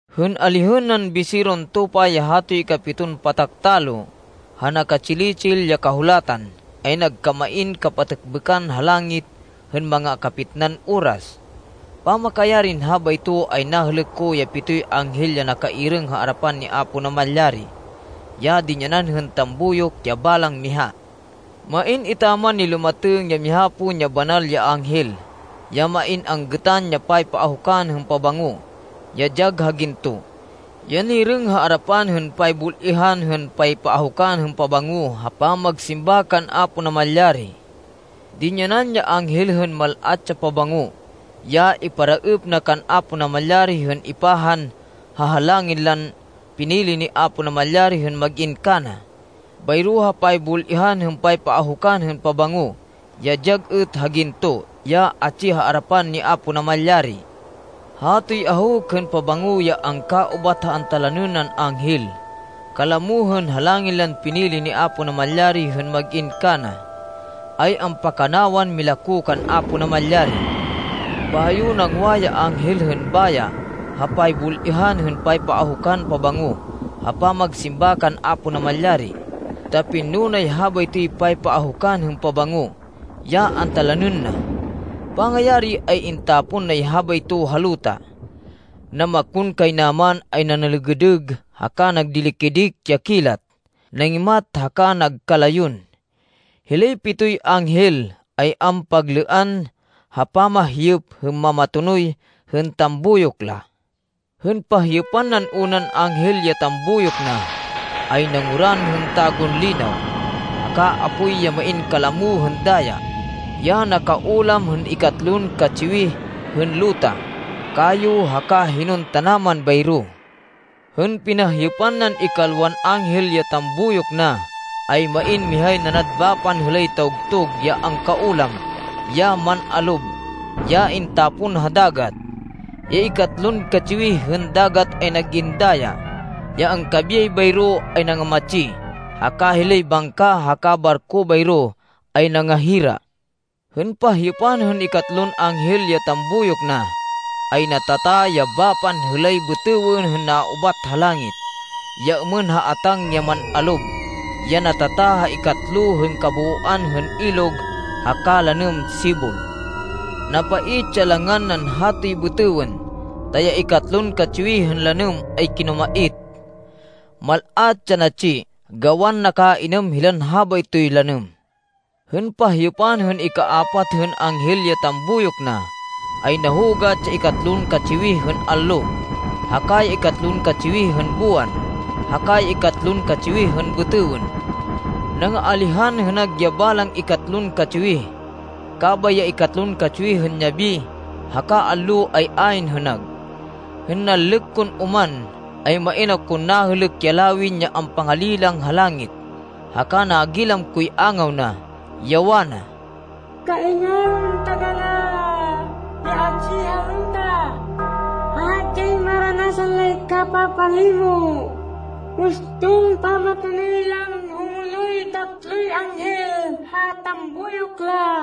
Hên alihên nan Biseron Tupa ya hatoy ikapiton patak talo ha naka-tsili-tsil ya kahulatan, ay nagkamain kapatêkbêkan ha langit hên manga kapitnan oras. Pamakayarin habayto, ay nahêlêk ko ya pitoy anghel ya nakairêng ha arapan ni Apo Namalyari, ya dinyanan hên tambuyok ya balang miha. Main etaman nilumatêng ya miha pon ya banal ya anghel, ya main anggêtan ya paypaahukan hên pabango, ya dyag ha ginto, ya nirêng ha arapan hên paybul-ihan hên paypaahukan hên pabango ha pamagsimba kan Apo Namalyari. Dinyanan ya anghel hên mal-at ya pabango, ya iparaêp na kan Apo Namalyari hên ipahan ha halangin lan pinili ni Apo Namalyari hên mag-in kana, bayro ha paybul-ihan hên paypaahukan hên pabango, ya dyag êt ha ginto ya atsi ha arapan ni Apo Namalyari. Hatoy ahuk hên pabango ya angkaubat ha antalanên nan anghel, kalamo hên halangin lan pinili ni Apo Namalyari hên mag-in kana, ay ampakanawan milako kan Apo Namalyari. Bayo nangwa ya anghel hên baya ha paybul-ihan hên paypaahukan pabango ha pamagsimba kan Apo Namalyari, ta pinno nay habaytoy paypaahukan hên pabango, ya antalanên na. Pangayari, ay intapon nay habayto ha luta. Namakonkaynaman ay nanêlêgêdêg haka nagdili-kidik ya kilat, nangimat haka nagkalayon. Hilay pitoy anghel ay ampaglêan ha pamahyêp hên mamatonoy, hên tambuyok la. Hên pahyêpan nan unan anghel ya tambuyok na, ay nanguran hên tagunlinaw, haka apoy ya main kalamo hên daya, ya nakaulam hên ikatlon katsiwih hên luta, kayo haka hinon tanaman bayro. Hên pinahyêpan nan ikalwan anghel ya tambuyok na, ay main mihay nanad bapan hêlay tawgtug ya angkaulam ya man-alob, ya intapon ha dagat. Ya ikatlon katsiwih hên dagat ay nag-in daya. Ya angkabiyay bayro ay nangamatsi, haka hilay bangka haka barko bayro, ay nangahira. Hên pahyêpan hên ikatlon anghel ya tambuyok na, ay natata ya bapan hêlay bêtêwên hên naubat ha langit, ya êmên ha atáng ya man-alob, ya natata ha ikatlo hên kabooan hên ilog haka lanêm sibol. Napait ya langan nan hatoy bêtêwên, ta ya ikatlon katsiwih hên lanêm ay kinumait. Mal-at ya natsi gawan nakainêm hilan habaytoy lanêm. Hên pahyêpan hên ikaapat hên anghel ya tambuyok na, ay nahugat ya ikatlon katsiwih hên allo, haka ya ikatlon katsiwih hên buwan, haka ya ikatlon katsiwih hên bêtêwên. Nangaalihan hênag ya balang ikatlon katsiwih, kabay ya ikatlon katsiwih hên yabi haka allo, ay ayn hênag. Hên nanlêk kon oman, ay main akon nahêlêk ya lawin ya ampangalilang ha langit, haka nagilam koy angaw na, ya wana, “Kaingalon taganá ya atsi ha luta, ha hadyay maranasan lay kapapalimo uston pamatonoy lan humonoy tatloy anghel ha tambuyok la!”